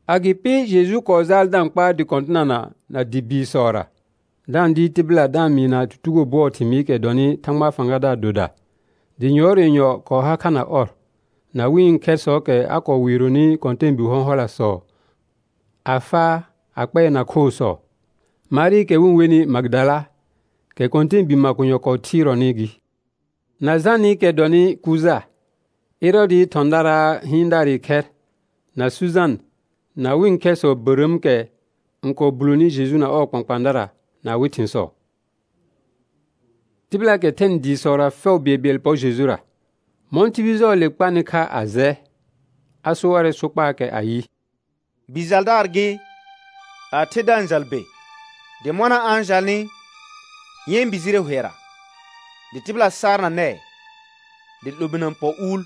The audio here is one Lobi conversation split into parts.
Agɩpɩ Jeju kɔɔ jaal da-n kpaar dɩ kɔ̃tɩnana na dɩ biisɔra, da-n dɩɩr tɩbɩla da-n mɩɩna tutugo bʋɔɔ thɩmɩɩkɛ dɔnɩ Thãgbaa fãgadaar doda. Dɩ yʋɔr yenyɔ kɔɔ har kha na ɔr, na wɩ̃ khɛrsɔɔkɛ a kɔɔ weeronɩ kɔ̃tɛɛbi hɔ̃hɔlasɔ a faa a kpɛɛna khoosɔ. Marɩɩkɛ wɩ-n wenɩ Magɩdala, kɛ kɔ̃tɛɛbii makonyɔ kɔɔ thɩɩrɔnɩ gɩ, na Janɩkɛ dʋɔnnɩ Kuja, Ɛrɔɔdɩɩ thɔ̃daraa hɩɩndaarɩ khɛr, na Sujan, na wɩ̃ khɛrsɔ bərəəmkɛ n kɔɔ buloni Jeju na ɔɔ kpãkpãadara na awɩ thɩ̃sɔ. Tɩbɩlaakɛ thɛnɩ dɩɩsɔra fɛʋ bɩɛlbɩɛl pɔr Jejura. Mɔ̃ tibil jɔjʋɔɔle kpanɩ kha a jɛ, a so warɛ sokpaakɛ ayɩ: Bi jaldaar gɩ, a the da-n jal be. Dɩ mɔna a-n jalnɩ yɛ̃ bi jire hʋɛra, dɩ tɩbɩla saar na nɛɛ, dɩ 'lominə pɔ uul.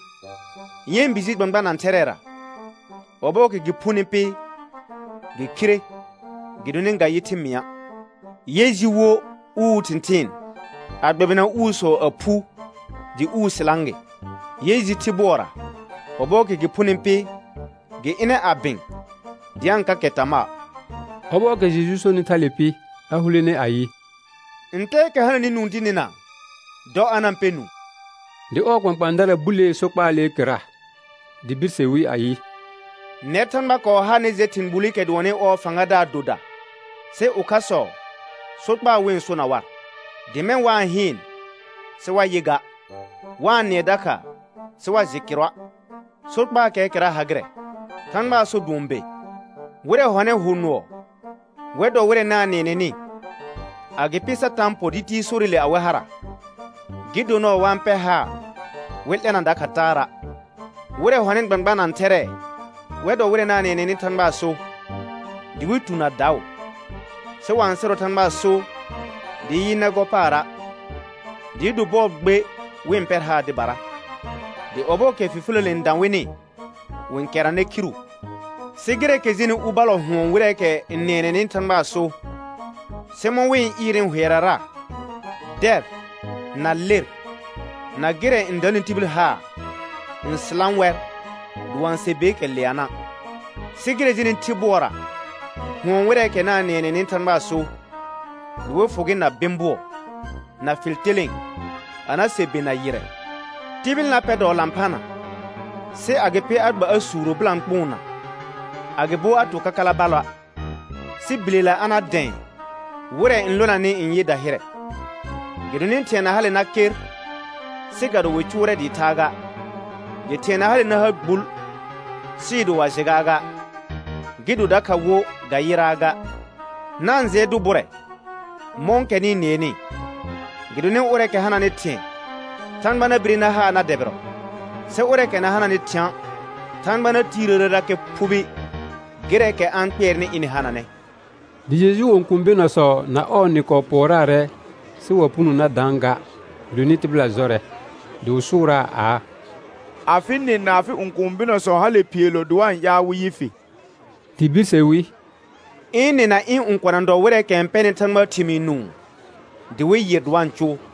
Yɛ̃ bi ji gbãgbã nã thɛrɛɛra. Ɔbɔɔkɛ gɩ phuni pɩ, gɩ khire gɩdonɩ ga-n yɩ thɩ mɩ̃a'. Yɛ ji wo uu thɩ̃thɩɩn a gbɛbɩna uusɔ, a phu dɩ uu sɩlã gɩ. Yɛ ji thɩ bʋɔra. Ɔbɔɔkɛ gɩ phuni pɩ, gɩ ɩnɛ a bɩ̃ dɩ a-n kakɛ tamaa. Ɔbɔɔkɛ Jeju sonɩ thale pɩ, a hulene ayɩ: Ntɛɛkɛ hananɩ nũu dɩ nɩna, dɔ a na-n pɛ nũu. Dɩ ɔɔ kpãkpãadara bulee sokpaalee kɩrra. Dɩ birse wi ayɩ: Nɛr Thãgba kɔɔ ha nɩ jɛ thɩ̃ gbulikɛ dʋɔnnɩ ɔɔ fãgadaar doda. Sɩ ʋkhasɔ sokpaa wɩ-n sona war, dɩ mɛ̃ «wa-n hɩɩn sɩ wa yɩ ga, wa-n nɩɛ dakha sɩ wa jɩ kɩrʋa'.» Sokpaakɛɛ kɩrra ha gɩrɛ: Thãgbaa so dʋɔn be. Wɩrɛ hɔnɩ hʋ nʋɔ wɛr dɔ wɩrɛ na-n nɩɛnɛnɩ, agɩpɩ Satã n pɔ dɩ ti sorɩle awɩ hara, gɩ do nɔɔ wa pɛr haar wɩ 'lɛna dakha taara'. Wɩrɛ hɔnɩ gbãgbã nã thɛrɛɛ wɛr dɔ wɩrɛ na-n nɩɛnɛnɩ Thãgbaa so, dɩ wɩ tu na daʋ, sɩ wa-n sɩrɔ Thãgbaa so dɩɩ yɩ nɛ gɔ paara', dɩɩ do bɔɔ gbe wɩ pɛr haar dɩbara. Dɩ ɔbɔɔkɛ fifiləle n dã wɩnɩ, wɩ-n kɛrnanɛ khiru. Sɩ gɩrɛɛkɛ jenɩ u ballɔ hʋɔn wɩrɛɛkɛ n nɩɛnɛnɩ Thãgbaa so, sɩ mɔ̃ wɩ-n ɩɩrnɩ hʋɛrara, dɛr na ler, na gɩrɛ n danɩ tibil haar n sɩlã wɛr, dɩ wa-n se beekɛ leana'. Sɩ gɩrɛ jenɩ thɩ bʋɔra hʋɔn wɩrɛɛkɛ na-n nɩɛnɛnɩ Thãgbaa so dɩ wɩ fʋ gɩ na bɩ̃ bʋɔ, na fɩl telẽe a na se be na yɩrrɛ. Tibil na pɛr dɔɔ lãphana sɩ agɩpɩ a gba a suuro bɩlãkpʋʋnna, agɩbo a to kakala ballɔa', sɩ bilela a na dɛ̃ɛ wɩrɛ n lonanɩ n yɩ dahɩrɛ. Gɩdonɩ thɩ̃ɛ na hale na ker sɩ ga do wɩ cʋʋrɛ dɩɩ thaa ga, dɩ thɩ̃ɛ na hale na ha gbul sɩɩ do wa jɩ gaaga, gɩ do dakha wo ga yɩraa ga. Na-n jɩɛ dʋ bʋrɛ mɔ̃kɛ nɩ-n nɩɛnɩ, gɩdonɩ ʋrɛɛkɛ hananɩ thɩ̃ɛ, Thãgba na bire na haa na dɛbɩrɔ; sɩ ʋrɛɛkɛ na hananɩ thɩ̃a', Thãgba na tiirəərerakɛ phubi gɩrɛɛkɛ a-n kpɩɛrnɩ ɩnɩ hananɛ. Dɩ Jejuu õkũu bɩnɔsɔ na ɔɔ nɩ kɔɔ pʋɔraarɛ, sɩ wa puno a na dãa ga gɩdonɩ tɩbɩla jɔrɛ. Dɩ wɩ sʋʋraa aa: Afɩ nɩ na afɩ õkũu bɩnɔsɔ hale phiilo dɩ wa-n ƴaal wɩ yɩ fɩ. Dɩ birse wi: Ɩ̃̃̃ nɩ na ɩ̃ õkona dɔ wɩrɛɛkɛ n pɛnɩ Thãgbaa thɩmɩɩ nũu, dɩ wɩ yɩr dɩ wa-n cʋʋ.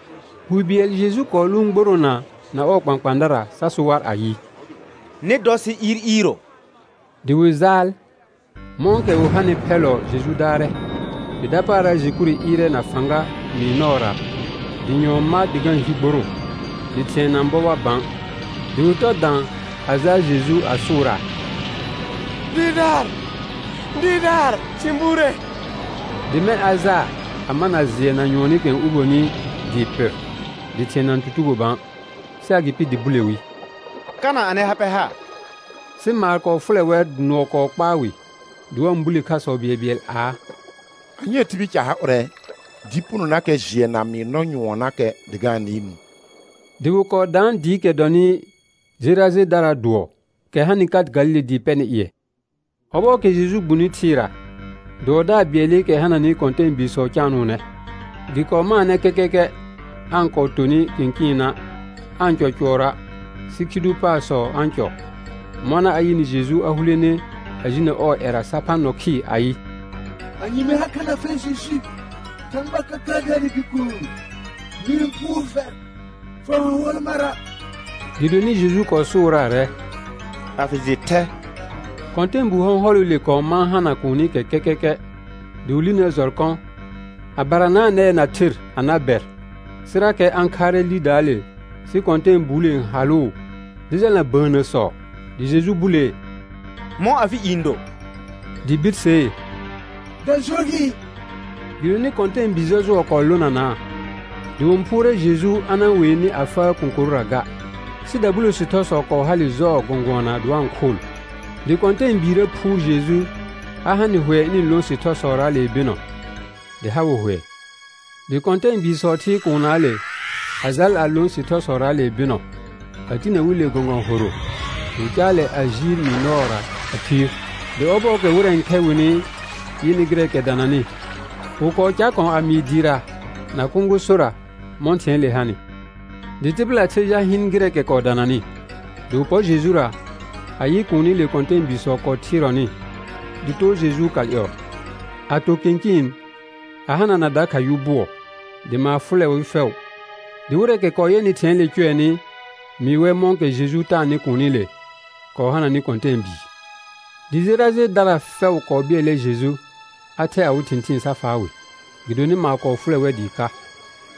Wi bɩɛl Jeju kɔɔ lʋʋn gboroona na ɔɔ kpãkpãadara, sa so war ayɩ: Nɩ dɔ sɩ iir iiro; dɩ wɩ jaal. Mɔ̃kɛ wɩ hanɩ phɛllɔ Jeju daarɛ. Dɩ dapaara jɛkhure ɩɩrɛ na fãga mɩɩr nɔɔra, dɩ nyʋɔn ma dɩ ga-n hi gborõo, dɩ thɩ̃ɛ na-n bɔ war bã. Dɩ wɩ tɔ dã a jaa Jeju a sʋʋraa: Dɩɩrdaar, dɩɩrdaar, sɩ-n buure. Dɩ mɛ̃ a jaa a mana jɩɛ na nyʋɔnɩkɛ n uboni dɩɩ pɩr, dɩ thɩ̃ɛ na-n tutugo bã. Sɩ agɩpɩ dɩ bule wi: Kana anɩ ha pɛ ha? Sɩ maar kɔɔ fʋlɛ wɛr dɩ nʋɔ kɔɔ kpaa wɩ, dɩ wa-n bule khasɔ bɩɛlbɩɛl aa: Anyee tibil ca ha ʋrɛ, dɩ punonakɛ jɩɛ na mɩɩr nɔ nyʋɔnnakɛ dɩ ga-n nɩɩ nũu? Dɩ wɩ kɔɔ daan dɩɩkɛ dɔnɩ Jerajedaraa dʋɔ, kɛ hanɩ ka Galile dɩɩ pɛnɩ ƴɩɛ. Ɔbɔɔkɛ Jeju gbuni thɩɩra, dʋɔdaar bɩɛlɩkɛ hananɩ kɔ̃tɛɛbiisɔ caanʋʋnɛ. Gɩ kɔɔ maanɛ kɛkɛkɛ aa-n kɔɔ tonɩ kɩ̃kɩɩna', aa-n cɔ cʋɔrɔa', sɩ khi dʋ paarsɔ a-n cɔ. Mɔna a yɩnɩ Jeju, a hulene a jinə ɔɔ ƴɛra sa phã nɔ khɩɩr ayɩ: Anye mɩ ha kha na fɛr Jeju, Thãgba Kəkəədaarɩ Bikuun? Mɩ-n phʋʋr fɛr fa-n hʋɔl mara'. Gɩdonɩ Jeju kɔɔ sʋʋraarɛ: A fɩ jɩ thɛ. Kɔ̃tɛɛbu hɔ̃hɔlɩle kɔɔ mãa hana kuunikɛ kɛkɛkɛ, dɩ wɩ linəə jɔrkɔ a baranaa nɛɛ na ther a na bɛr, sɩrakɛ a-n khaarɛ lidaale sɩ kɔ̃tɛɛbuule n halʋʋ dɩ jalna bəənnəsɔ. Dɩ Jeju bulee: Mɔ̃ afɩ i n do? Dɩ birsee: Dajɔ gɩ. Gɩdonɩ kɔ̃tɛɛbi jɔjʋɔ kɔɔ lonanaa. Dɩ wɩ-n phʋʋrɛ Jeju a na-n wee nɩ a faa kõkorʋra ga. Sɩ dabulo sɩthɔsɔ kɔɔ hale jɔɔ gɔ̃gʋɔna dɩ wa-n khʋʋl. Dɩ kɔ̃tɛɛbiirə phʋʋr Jeju a ha nɩ hʋɛ ɩnɩ-n lõ sɩthɔsɔraale bɩnɔ, dɩ ha wɩ hʋɛ. Dɩ kɔ̃tɛɛbiisɔ thɩɩr kuunnaale a jal a lõ sɩthɔsɔraale bɩnɔ a tinə wi le gɔ̃gɔ̃ horo, dɩ wɩ caalɛ a jiir mɩɩr nɔɔra a khiir. Dɩ ɔbɔɔkɛ wɩrɛ n khɛ wɩnɩ yɩnɩ gɩrɛɛkɛ dananɩ, wɩ kɔɔ car kɔ̃ a mɩɩ dɩɩra na kõgosora mɔ̃ thɩ̃ɛɛle hanɩ. Dɩ tɩbɩla the jal hɩɩn gɩrɛɛkɛ kɔɔ dananɩ; dɩ wɩ pɔr Jejura, a yɩ kuunile kɔ̃tɛɛbiisɔ kɔɔ thɩɩrɔnɩ dɩ too Jejuu kal ƴɔɔ, a to kɩ̃kɩɩn a hanana dakha yʋ bʋɔ. Dɩ maar fʋlɛ wɩ fɛʋ. Dɩ wɩrɛɛkɛ kɔɔ yɛnɩ thɩ̃ɛɛle cʋɛnɩ mɩɩ wɛr mɔ̃kɛ Jeju taanɩ kuunile kɔɔ hananɩ kɔ̃tɛɛbii. Dɩ Jerajedara fɛʋ kɔɔ bɩɛlɛ Jeju a thɛ awɩ thɩ̃thɩɩn sa faa wɩ, gɩdonɩ maar kɔɔ fʋlɛ wɛr dɩɩ ka.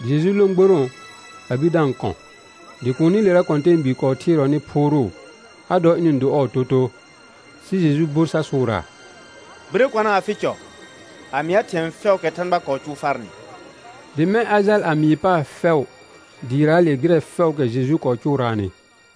Dɩ Jeju lõ gborõo a bir da-n kɔ̃. Dɩ kuunilera kɔ̃tɛɛbii kɔɔ thɩɩrɔnɩ phʋʋrʋʋ a dɔ ɩnɩ-n do ɔɔ totoo. Sɩ Jeju bor sa sʋʋraa: Birə kɔna afɩ cɔ a mɩa thɩ̃ɛ fɛʋʋkɛ Thãgba kɔɔ cʋʋ farnɩ. Dɩ mɛ̃ a jal a mɩɩ paar fɛʋ dɩɩraale gɩrɛ fɛʋʋkɛ Jeju kɔɔ cʋʋraanɩ.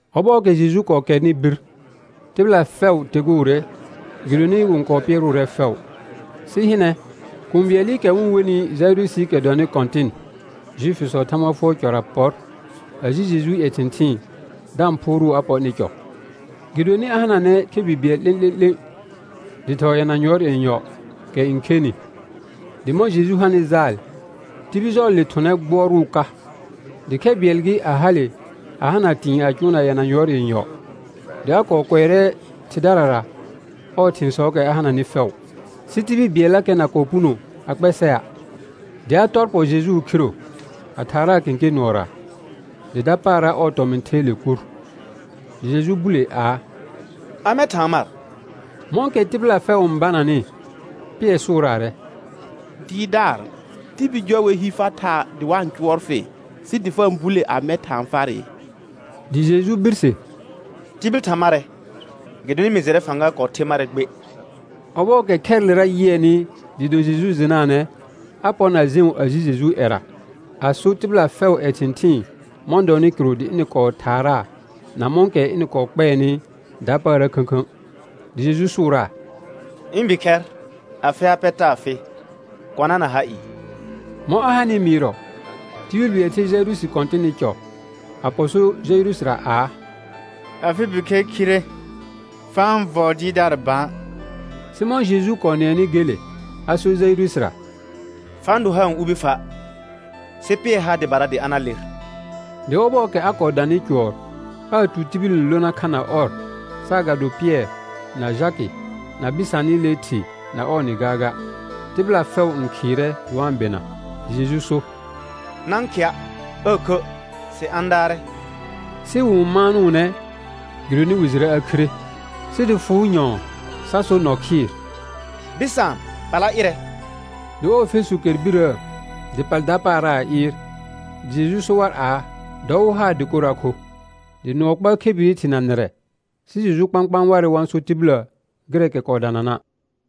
Ɔbɔɔkɛ Jeju kɔɔ kɛrnɩ bir, tɩbɩla fɛʋ teguure, gɩdonɩ wɩ-n kɔɔ pɩɛrʋʋrɛ fɛʋ. Sɩ hɩnɛ, kũu bɩɛlɩkɛ wɩ-n wenɩ Jaɩrʋsɩɩkɛ dɔnɩ kɔ̃tɩn Juifisɔɔ Thagba fʋɔr cɔra pɔr, a ji Jejuu ƴɛ thɩ̃thɩɩn da-n phʋʋrʋʋ a pɔ ɩnɩ cɔ. Gɩdonɩ a hananɛ khebi bɩɛl 'lẽ'lẽ'lẽ dɩ thɔɔ yɛna yʋɔr yenyɔ, kɛ n khenɩ. Dɩ mɔ̃ Jeju hanɩ jaal, tibil jɔɔle thʋnɛ gbʋɔrʋʋ ka. Dɩ khɛ bɩɛl gɩ, a hale a hana tɩ̃ɩ a cʋʋna yɛna yʋɔr yenyɔ, dɩ a kɔɔ kʋɛrɛ thɩdarara ɔɔ thɩ̃sɔɔkɛ a hananɩ fɛʋ, sɩ tibil bɩɛllakɛ na kɔɔ puno a kpɛsɛa'. Dɩ a tɔr pɔ Jejuu khiro a thaaraa kẽkẽ nʋɔra; dɩ dapaara ɔɔ tɔmɩ̃ theele kur. Dɩ Jeju bule aa: Amɛ thaan mar? Mɔ̃kɛ tɩbɩla fɛʋ n bananɩ Pɩɛr sʋʋraarɛ: Dɩɩrdaar, tibil jɔ wer hi far thaa dɩ wa-n cʋɔr fɩ, sɩ dɩ fa-n bule amɛ thaan farɩ? Dɩ Jeju birse: Tibil tha marɛ, gɩdonɩ mɩ jɩrɛ fãga kɔɔ the marɛ gbe. Ɔbɔɔkɛ khɛrɩlera yɩɛnɩ dɩɩ do Jeju jɩnaanɛ, a pɔr na jẽu a ji Jejuu ƴɛra, a so tɩbɩla fɛʋʋ ƴɛ thɩ̃thɩɩn mɔ̃ dɔnɩ kɩrʋ dɩ ɩnɩ kɔɔ thaaraa na mɔ̃kɛ ɩnɩ kɔɔ kpɛɛnɩ dapaara khə̃khə̃. Dɩ Jeju sʋʋraa: Ɩ̃ bikhɛr, afɩ ha pɛ taa fɩ, kɔna na ha ɩɩ. Mɔ̃ a hanɩ mɩɩrɔ, tibil bɩɛl ther Jaɩrʋsɩ kɔ̃tɩnɩ cɔ, a pɔ so Jaɩrʋsɩra aa: Afɩ bikhɛr khire. Fa-n vɔɔ Dɩɩrdaar bã. Sɩ mɔ̃ Jeju kɔɔ nɩɛnɩ gele, a sor Jaɩrʋsɩra: Fa-n do haar n ubi fa', sɩ pɩɛr haar dɩbara dɩ a na ler. Dɩ ɔbɔɔkɛ a kɔɔ danɩ cʋɔr aa tu tibil n lona kha na ɔr, saagado Pɩɛr na Jakɩ na bɩsaanɩlee thɩ na ɔɔ nɩ gaaga. Tɩbɩla fɛʋ n khɩɩrɛ dɩ wa-n bɩna. Dɩ Jeju so: Na-n khɩa' aa khə', sɩ a-n daarɛ. Sɩ wɩ-n maanʋʋnɛ gɩdonɩ wɩ jɩrɛ a khire. Sɩ dɩ fʋʋ nƴɔ̃ɔ sa so nɔ khɩɩr: Bɩsaan, pala ɩrɛ. Dɩ ɔɔ fesu kɛr birəə, dɩ pal dapaara a ɩɩr. Dɩ Jeju so war aa, dɔ wɩ haa dɩkor a kho. Dɩ nʋɔ kpaa khebiri thɩ na nɩrɛ, sɩ Jeju kpãkpãa warɛ wa-n so tibillə gɩrɛɛkɛ kɔɔ danana'.